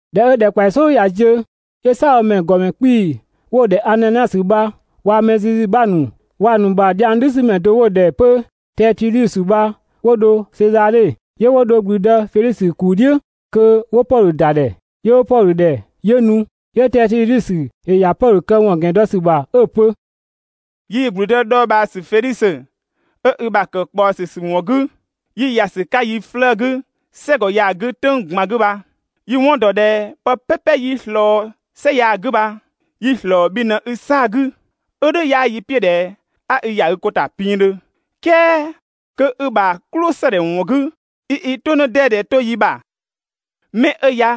꞊Dhɛ 'ö ‑dhɛkpaɔyi "sɔɔdhu ꞊ya ziö, 'yö "saabhomɛ ‑gɔmɛ 'kpii‑ 'wo‑ ‑dhɛ Ananiasö bha waa‑ mɛ zizi ‑nu 'bha ‑nu, waa‑ ‑nu ‑bha dhiang "dhüsümɛ do 'wo‑ ‑dhɛ 'pö Tɛɛtudhusö bha 'wo dho Sezadhe. 'Yö 'wo dho ‑gblüdë Fedhisö ‑kuu "dhiʋ̈ kö 'wo Pɔdhö ‑da ‑dhɛ. 'Yö 'wo Pɔdhö ‑dhɛ, 'yö nu, 'yö Tɛɛtudhusö ‑yö ‑ya Pɔdhö këwɔn ‑gɛn dɔ ‑sü ‑bha 'ö‑ pö: «Yii‑ ‑gblüdë dhɔɔbhaasü Fedhisö 'ö i ‑bha ‑kë ꞊kpaɔsü ‑sü ‑wɔn 'gü, 'yi ‑ya ‑sü 'ka yi 'flëë‑ 'gü "sɛgɔ ya‑ 'gü "tʋ̈ng ꞊gban 'gü bha, yi‑ 'wɔn ‑dɔ ꞊dhɛ pë "pɛpɛ 'yi‑ ꞊slɔɔ "sɛ ya‑ 'gü bha yi‑ ‑slɔɔ bhi ꞊në i 'saa‑ 'gü. 'Ö "dhʋ̈ 'yaa n "piʋ̈ ꞊dhɛ 'a i ‑ya i ko ‑ta pinngdhö, "kɛɛ kö i ‑bha "klʋsëdhɛ ‑wɔn 'gü 'i i "tʋ 'në 'dɛdɛ 'to yi ‑bha. 'Mɛ 'ö ya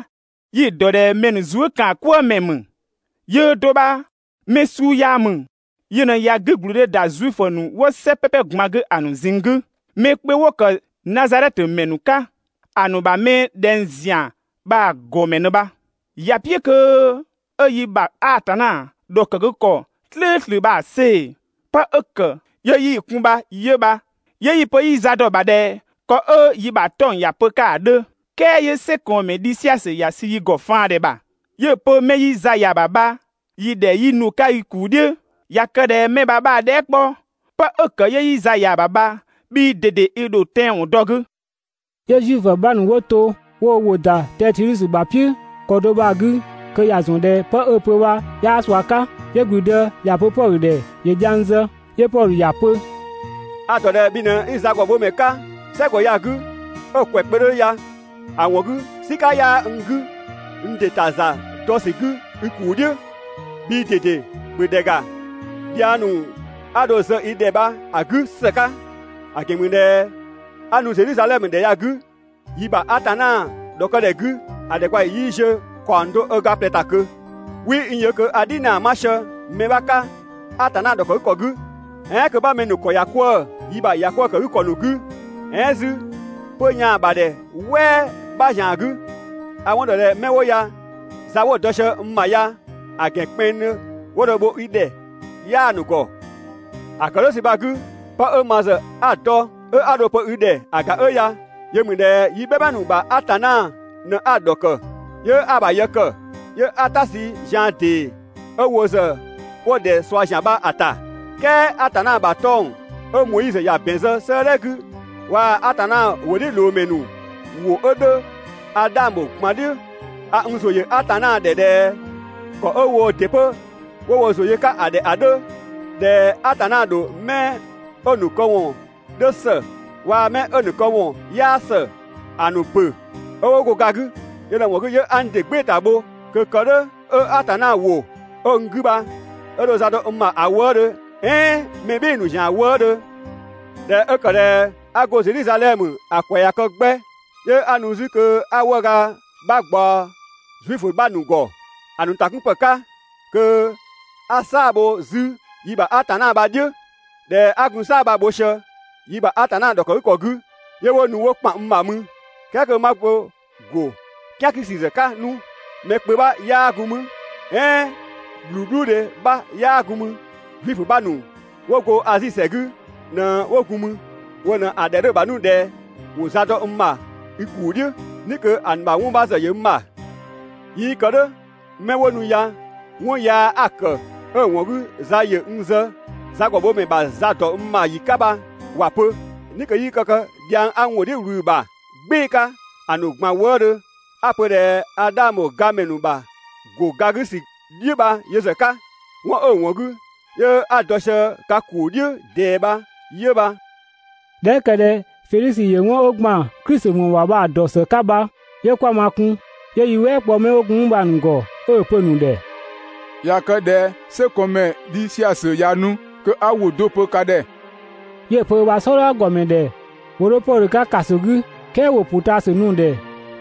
yi‑ dɔ ꞊dhɛ mɛ ‑nu zuëkaankwëëmɛ ‑mü. Yöö do bha mɛ suu yaa ‑mü, yö ꞊në ꞊ya 'gügblüdhe ‑da Zuifö ‑nu 'wo "sɛ "pɛpɛ ꞊gban 'gü ‑a ‑nu ꞊zinng 'gü. Mɛ kpö 'wo ‑kë Nazadhɛtö ‑mɛ ‑nu 'ka, ‑a ‑nu ‑bha mɛ ꞊dhɛng ‑zian bha‑ ‑gɔmɛ ꞊në bha. ‑Ya "piʋ̈ kö 'ö yi ‑bha Atanna ‑dhɔkëgükɔ "slʋ̈ʋ̈slʋ̈ bha‑ see‑, 'pë 'ö ‑kë 'yö 'yi‑ kun bha 'yö bha. ['Yö yi‑ 'pö 'yi za dɔ‑ ‑bha ꞊dhɛ ‑kɔ 'ö yi ‑bha 'tɔng‑ ‑ya pö‑ 'ka ‑a 'dhö. "Kɛɛ 'yö "sɛkɔɔnmɛ Dhisiasö ‑ya sü yi ‑gɔ faandhɛ ‑bha, 'yö‑ pö 'mɛ 'yi za ‑ya ‑bha bha yi‑ ‑dhɛ 'yi nu‑ 'ka i ‑kuu "dhiʋ̈.] ꞊Ya kë ꞊dhɛ 'mɛ bha 'bha‑ dhɛɛ" 'kpɔ, 'pë 'ö ‑kë 'yö 'yi za ‑ya ‑bha bha, bhii ꞊dede i ‑dho tɛanwɔn dɔ‑ 'gü. 'Yö Zuifö ‑nu 'bha ‑nu 'wo to 'wo wo ‑wʋ ‑da Tɛɛtudhusö ‑bha "piʋ̈ ‑kɔ do bha‑ 'gü kö ‑ya ‑zɔn ꞊dhɛ 'pë 'ö‑ pö bha 'yaa ꞊sua 'ka. 'Yö ‑gblüdë ‑ya pö Pɔdhö ‑dhɛ ‑yö dhiang zë. 'Yö Pɔdhö ‑ya pö: «A‑ ‑dɔ ꞊dhɛ bhi ꞊në 'i zagɔbhomɛ 'ka "sɛgɔ ya‑ 'gü 'ö‑ ‑kwɛ kpö 'dhö ya. ‑A ‑wɔn 'gü "sika 'yaa n 'gü n ‑dɩ ‑ta ‑za dɔ ‑sü 'gü i ‑kuu "dhiʋ̈. Bhii ꞊dede ‑bhö ‑dhɛ ‑ga dhiang ‑nu 'a dho‑ zë i ‑dhɛ bha‑ 'gü ‑së 'ka, ‑a ‑gɛn ‑mü ꞊dhɛ 'a nu Zedhizadhɛmö ‑dhɛ ya‑ 'gü, yi ‑bha Atanna ‑dhɔkë ‑dhɛ 'gü ‑a ‑dhɛkpaɔyi 'yii ziö ‑kaɔng do ö ga ꞊plɛ ‑ta ꞊kö. 'Wii n yö kö a "dhinaa 'ma sië mɛ 'bha 'ka Atanna ‑dhɔkëgükɔ 'gü, "ɛɛn kö 'ma mɛ ‑nu ‑kɔ ‑ya 'kwëë‑ yi ‑bha ‑bhɔ "kwëë ‑kë 'gü ‑kɔ ‑nu 'gü, "ɛɛn 'zü 'pö‑ yaan‑ ‑bha ‑dhɛ "wɛɛ 'bha ‑zian 'gü. A‑ 'wɔn ‑dɔ ꞊dhɛ 'mɛ 'wo ya za 'wo‑ dɔ sië n ‑bha ya‑ ‑gɛn kpɛnngdhö 'wo dho‑ bho i ‑dhɛ 'yaa‑ ‑nu ‑gɔ. ‑A ‑kë "dhʋ̈ ‑sü bha‑ 'gü, 'pë 'ö ma ‑zë 'a‑ dɔ 'ö 'a dho‑ pö i ‑dhɛ ‑a ‑ga 'ö ya: Yö ‑mü ꞊dhɛ yi "bhɛma ‑nu ‑bha Atanna ꞊në 'a‑ ‑dhɔkë 'yö 'a‑ ‑bha yë ‑kë, 'yö 'a "ta sü zian ‑dee 'ö wo ‑zë 'wo‑ ‑dhɛ ꞊sua ‑zian bha‑ ‑ta. "Kɛɛ Atanna ‑bha 'tɔng‑ 'ö Moizö ‑ya ‑bɛn zë 'sëëdhɛ 'gü waa‑ Atanna ‑wʋdhiʋ̈loomɛ ‑nu ‑wʋ 'ö 'dhö, a 'dhang ‑bho ꞊gban "dhiʋ̈. A n ‑zʋ ‑yö Atanna ‑dhɛ ꞊dhɛ ‑kɔ 'ö woo ‑dɩ 'pö 'wo wo ‑zʋ yö‑ 'ka ‑a 'dhö, ꞊dhɛ Atanna ‑dho 'mɛ 'ö‑ ‑nu këwɔn 'dhö ‑së waa‑ mɛ 'ö‑ ‑nu këwɔn 'yaa ‑së ‑a ‑nu ‑bö 'ö 'wo go ga 'gü. Yö ꞊në‑ ‑wɔn 'gü 'yö 'a n ‑dɩ "gbɩɩ‑ ‑ta bho kö kë "dhʋ̈ 'ö Atanna ‑wʋ 'ö n 'gü bha 'ö dho za dɔ n ‑bha ‑a wëëdhö "ɛɛn mɛ "bhɩɩ‑ ‑nu ‑zian wëëdhö. ꞊Dhɛ 'ö ‑kë ꞊dhɛ 'a go Zedhizadhɛmö ‑a ‑kwɛ ꞊ya kë 'gbɛ, 'yö 'a nu 'zü kö 'a 'wëëga 'bha ꞊gbaɔ Zuifö ‑nu 'bha ‑nu ‑gɔ ‑a ‑nu ‑takunpë 'ka kö 'a "saa‑ bho 'zü yi ‑bha Atanna bha‑ "dhiʋ̈. ꞊Dhɛ 'a gun "saa‑ bha‑ bho sië yi ‑bha Atanna ‑dhɔkëgükɔ 'gü, 'yö 'wo nu 'wo ‑kpan n ‑bha mü, "kɛɛ kö 'ma bo ‑go "kian 'gü ‑sü ‑zë 'ka 'nu. Mɛ kpö 'bha 'yaa gun mü "ɛɛn ꞊bhluubhluudhe 'bha 'yaa gun mü. Zuifö 'bha ‑nu 'wo go Azi ‑sɛ 'gü ꞊në 'wo gun mü, wo ꞊në‑ ‑dhɛ 'dhö‑ ‑bha 'nu ꞊dhɛ ‑wo za dɔ n ‑bha i ‑kuu "dhiʋ̈, "ni kö ‑a ‑nu ‑bha 'wɔn 'bha ‑zë ‑yö n ‑bha. 'Yii kë "dhʋ̈ 'mɛ 'wo nu ya 'wɔn yaa 'a‑ ‑kë 'ö‑ ‑wɔn 'gü ‑za ‑yö n zë zagɔbhomɛ ‑bha za ‑dɔ n ‑bha ‑yi 'ka bha ‑wa pö. "Ni kö 'yii kë dhiang 'a n ‑wʋ "dhiʋ̈ ꞊wlü‑ ‑bha "gbɩɩ‑ 'ka ‑a ‑nu ꞊gban wëëdhö 'a‑ pö ꞊dhɛ a 'dhang ‑bho gamɛ ‑nu ‑bha ‑go ga 'gü ‑sü "dhiʋ̈ bha yö ‑zë 'ka, 'wɔn 'ö‑ ‑wɔn 'gü 'yö 'a dɔ sië ka ‑kuu "dhiʋ̈ ꞊dɛɛ bha 'yö bha.» ꞊Dhɛ 'ö ‑kë ꞊dhɛ Fedhisö ‑yö 'wɔn 'ö ‑gban Klisi ‑wɔn ‑bha bha‑ ‑dɔ ‑së 'ka bha, 'yö 'kwa ma kun, 'yö yi "wɛɛ kpɔ 'mɛ 'wo gun 'mü bha‑ ‑nu ‑gɔ 'ö‑ pö‑ ‑nu ‑dhɛ: «꞊Ya kë ꞊dhɛ "sɛkɔɔnmɛ Dhisiasö ꞊ya nu kö 'a ‑wʋ do pö ka ‑dhɛ.» 'Yö‑ pö ö ‑bha "sɔdha ‑gɔmɛ ‑dhɛ ‑wo 'dho Pɔdhö 'ka ‑kaso 'gü "kɛɛ ‑wo ‑pʋtaasü nu‑ ‑dhɛ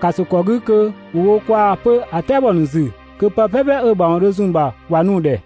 ‑kaso ‑kɔ 'gü kö ‑wo wo kwaa‑ 'pö ‑a "tɛabɔ ‑nu ‑zü kö pë "pɛpɛ 'ö‑ ‑mawɔn dho zun‑ ‑bha ‑wa nu‑ ‑dhɛ.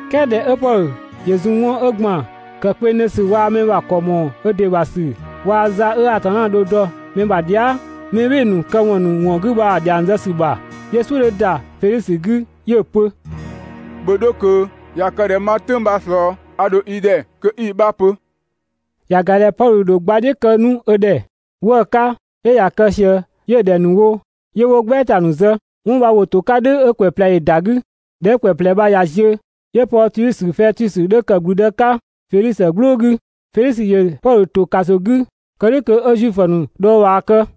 "Kɛɛ ꞊dhɛ 'ö Pɔdhö ‑yö zun 'wɔn 'ö ‑gban ‑kë kpengdhö ‑sü waa‑ mɛ ‑bha ‑kɔ ‑mɔɔ ö ‑dɩ ‑bha ‑sü waa‑ za 'ö Atanna dho‑ dɔ mɛ ‑bha dhia", mɛ "bhɩɩ‑ ‑nu këwɔn ‑nu ‑wɔn 'gü bha‑ ‑dhiang zë ‑sü ‑bha, 'yö "suʋ̈ 'dhö ‑da Fedhisö 'gü 'yö‑ pö: «‑Bhö 'dho ꞊kö, ꞊ya kë ꞊dhɛ 'ma "tʋ̈ng bha‑ ꞊slɔɔ a ‑dho i ‑dhɛ kö 'i‑ 'bha pö.» ‑Ya ‑ga ꞊dhɛ Pɔdhö dho gbadhiʋ̈ kë 'nu ö ‑dhɛ 'wëë‑ 'ka 'yö ꞊ya kë ꞊sië 'yö‑ ‑dhɛ ‑nu wo, 'yö 'wo "gbɛɛta ‑nu zë. 'Wɔn bha ‑wo ‑to 'ka "dhʋ̈ 'ö ‑kwɛ ꞊plɛ ‑yö ‑da 'gü. ꞊Dhɛ 'ö ‑kwɛ ꞊plɛ bha ꞊ya ziö, 'yö Pɔɔsiusö Fɛtusö 'dhö ‑kë ‑gblüdë 'ka Fedhisö "gblʋʋ 'gü. Fedhisö ‑yö Pɔdhö ‑to ‑kaso 'gü kë "dhʋ̈ 'nu kö 'ö Zuifö ‑nu dhɔɔbhaa kë.